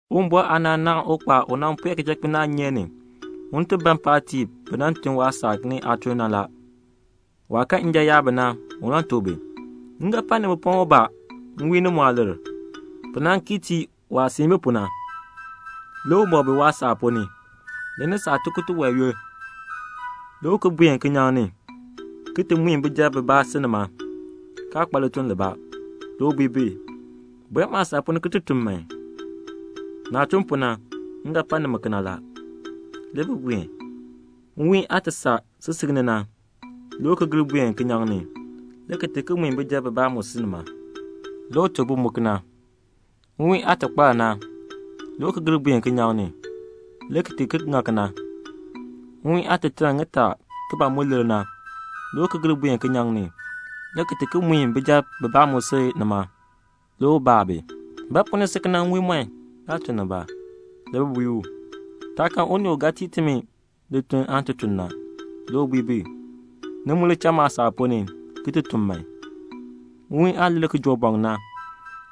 "Uwumbɔr aanaan naahn ukpaal u nan pue kichakpinaanyeek ni un ti ban paatiib bi nan tun waasaak ni aatuln. Waah kan njan yaab bi na, le u tuk bi, 'M ga pa nimi pɔŋ ubaa nwiin ni muah lir.' Bi nan kii tii waah siin bi pu na. Le u mɔk bi waasaak ponn ni. Le ni saa tikur tiwae yoonn, le u buen kinyaŋ ni le ki ti mui bijab bibaa si nima, kaa kpa lituln libaa. Le u bui bi, 'Buen maasaak ponn ni ki ti tun man. Naah tun pu na le m ga pa nimi.' Le bi buen. Nwiin aah saa sisik ni na, le u ki gir buen kinyaŋ ni, le ki ti mui bijab bibaa mu si nima. Le u tuk bi mu kena. Nwiin aah kpar na, le u ki gir buen kinyaŋ ni, le ki ki ŋa kena. Nwiin aah taln ŋitaa ki ban mu lir na, le u ki gir buen kinyaŋ ni, le ki ti mui bijab bibaa mu si nima. Le u baa bi, 'Ba pu ni si kena nwiimɔn, kaa tun nibaa?' Le bi bui u, 'Taa kan unii u ga tii timi lituln aan ti tun na.' Le u bui bi, 'Ni mu li cha maasaak ponn ni, ki ti tun man.' "Nwiin aah lir na kijoobɔŋ na,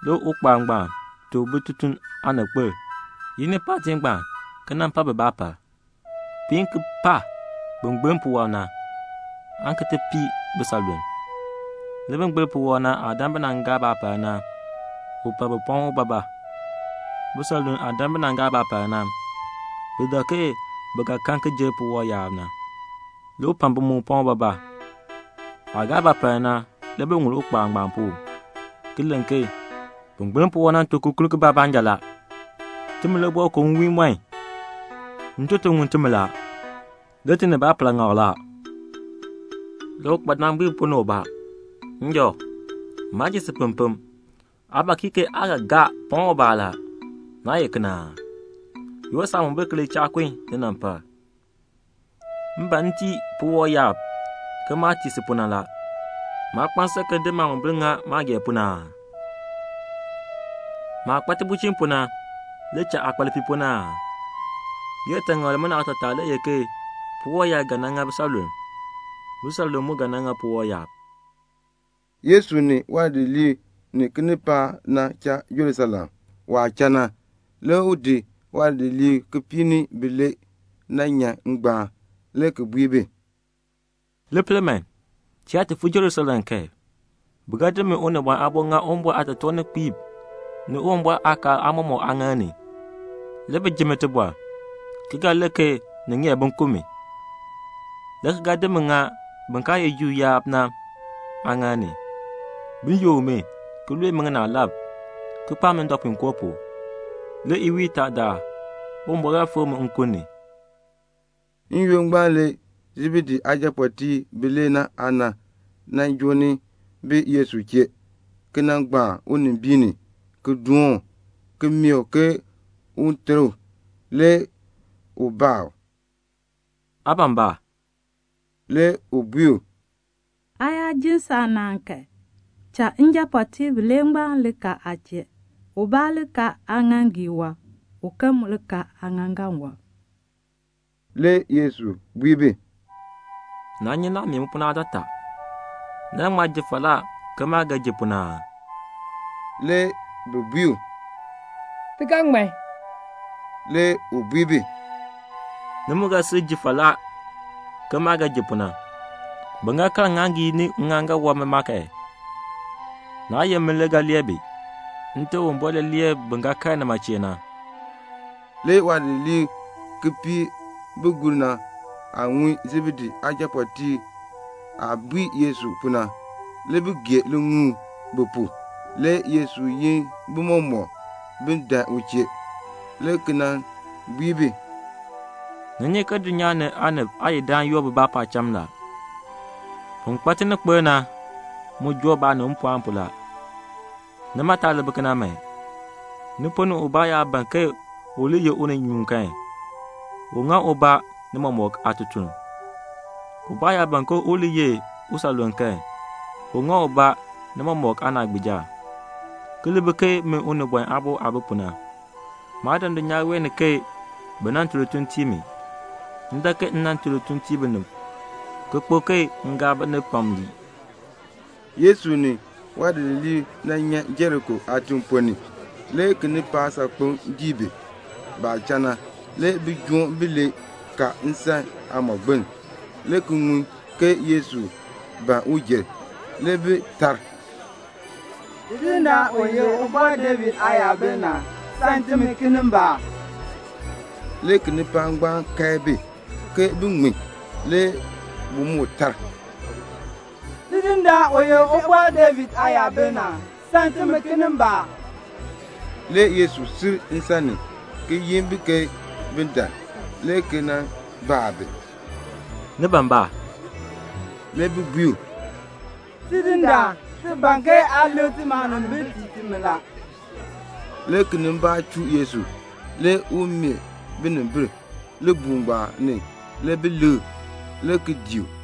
le ukpaal ngbaan tuk bitutum aaninkpil, 'Yi ni paatiib ngbaan ki nan pa bi baapal. Piin ki par bin gbiln puwɔb na, aan ki ti pii bisanlulm.' Le bin gbiln puwɔb na aah dan bi nan gaa baapal na, le u pa bi pɔŋ ubaabaa. Bisanlulm aah dan bi nan gaa baapal na, bi dak ke bi ga kan ki jer puwɔb yaab. Le u pa bi mu pɔŋ ubaabaa. Baah gaa baapal na, le bi ŋul ukpaal ngbaan pu, ki len ke, 'Bin gbiln puwɔb na tun kikurk kibaa baanja la. Timi le boo ko nwiimɔn. Ntoton ŋun timi la. Le ti ni baapal ŋma la.' Le ukpaadaan bui bi ponn ni ubaa, 'Njɔ, maa jin si pempem. Aa ba kii ke aa ga gaa pɔŋ ubaa la. Naa ye kena aa? Yoor saamombil ki li cha kun linampal. M ban m tii puwɔb yaab ke maah tii si pu na. Maa kpa nsan m di maamombil ki ŋa maah gee pu na aa? Maah kpa tibulchin pu na le cha aa kpa lipiipoln aa?' "Liyaataŋakl limina aatataa le ye ke puwɔb yaab ga nan ŋa bisanlulm. Bisanlulm mu ga nan ŋa puwɔb yaab." Le Yesu ni waadidiliib ni kinipaak nan cha Jerusalem. Waah cha na le u di waadidiliib kipiik ni bilee ki nyan ngbaan, le ki bui bi, "Li pel man, ti yaa fuu Jerusalem kan, bi ga di min Unibɔn Aabo ki di ŋa Uwumbɔr aatotoorninkpiib ni Uwumbɔr aakaal aamɔmɔkb aaŋaal ni, le bi ji mi tibɔr, le ki ga len ke ni ŋeer bin ku mi, le ki ga di mi ki di ŋa bin kaa ye Juu yaab na aaŋaal ni, bin yook mi, ki lue mi ŋinaalab, ki kpaa mi ndɔpuinkoo pu. Le iwiin itaadaal Uwumbɔr ga fikr mi nkun ni." N-yoonn ngbaan le Sebedee aajapɔɔtiib bilee aana nan joo ni bi Yesu chee, ki nan gbaan unimbiin ni, ki doon u, ki mee u ke un ter u. Le u baa u, "Aa ban ba?" Le u bui u, "Aa yaa ji saanaan kan, cha njapɔɔtiib bilee ngbaan li kal aa chee, ubaa li kal aaŋaaŋgii wɔb, uken mu li kal aaŋaaŋgan wɔb." Le Yesu bui bi, "Naa nyi naah mee mi pu na aatataa. Ni ga ŋma ji falaa ke maah ga ji pu na aa?" Le bi bui u, "Ti ga ŋman." Le u bui bi, "Ni mu ga sil ji falaa ke maah ga ji pu na. Bin ga kal ŋŋaaŋgii ni ŋŋaaŋgan wɔb ma kan, naa ye min le ga lee bi. Nte Uwumbɔr le lee bin ga kal nima chee na." Le waadidiliib kipiik bi gur na aah ŋun Sebedee aajapɔɔtiib aah bui Yesu pu na, le bi gee liŋuul bi pu. Le Yesu yin bi mɔmɔk bin dan u chee, le ki bui bi, "Ni nyi ke dulnyaa ni aanib aayidam yoor bibaa paacham la. Bin kpa tininkpil na mu joo baanib mpɔɔn pu la. Nimi, ni taa li bi kena man. Ni ponn ni ubaa yaa ban ke u li ye uninyuun kan, un ŋa ubaa ni mɔmɔk aatutuln. Ubaa yaa ban ke u li ye usanluln kan, un ŋa ubaa ni mɔmɔk aanaagbiija, ki li bi ke min Unibɔn Aabo aah bi pu na; maa dan dulnyaa wee ni ke bi nan tun lituln tii mi, m dan ke m nan tun lituln ki tii binib, ki kpo ke m gaa binib pam ki lii." Le Yesu ni waadidiliib nyan Jeriko aatiŋ ponn ni. Le kinipaak saakpeŋ dii bi. Baah cha na, le bijoom bilee ka nsan aamɔgbiln, le ki ŋun ke Yesu ban un jer. Le bi tar, "Tidindaan u ye Ubɔr David Aayabil na, sam timi kinimbaak." Le kinipaak ngbaan kae bi, ke bin ŋmin. Le bi moo tar, "Tidindaan, u ye Ubɔr David Aayabil na, sam timi kinimbaak." Le Yesu sil nsan ni, le ki yin bi ke bin dan, le ki baa bi, "Ni ban ba?" Le bi bui u, "Tidindaan, ti ban ke aa likr timi aanimbil tii timi." Le kinimbaak chuu Yesu. Le u meeh binimbil. Libuul ngbaan ni le bi likr, le ki dii u.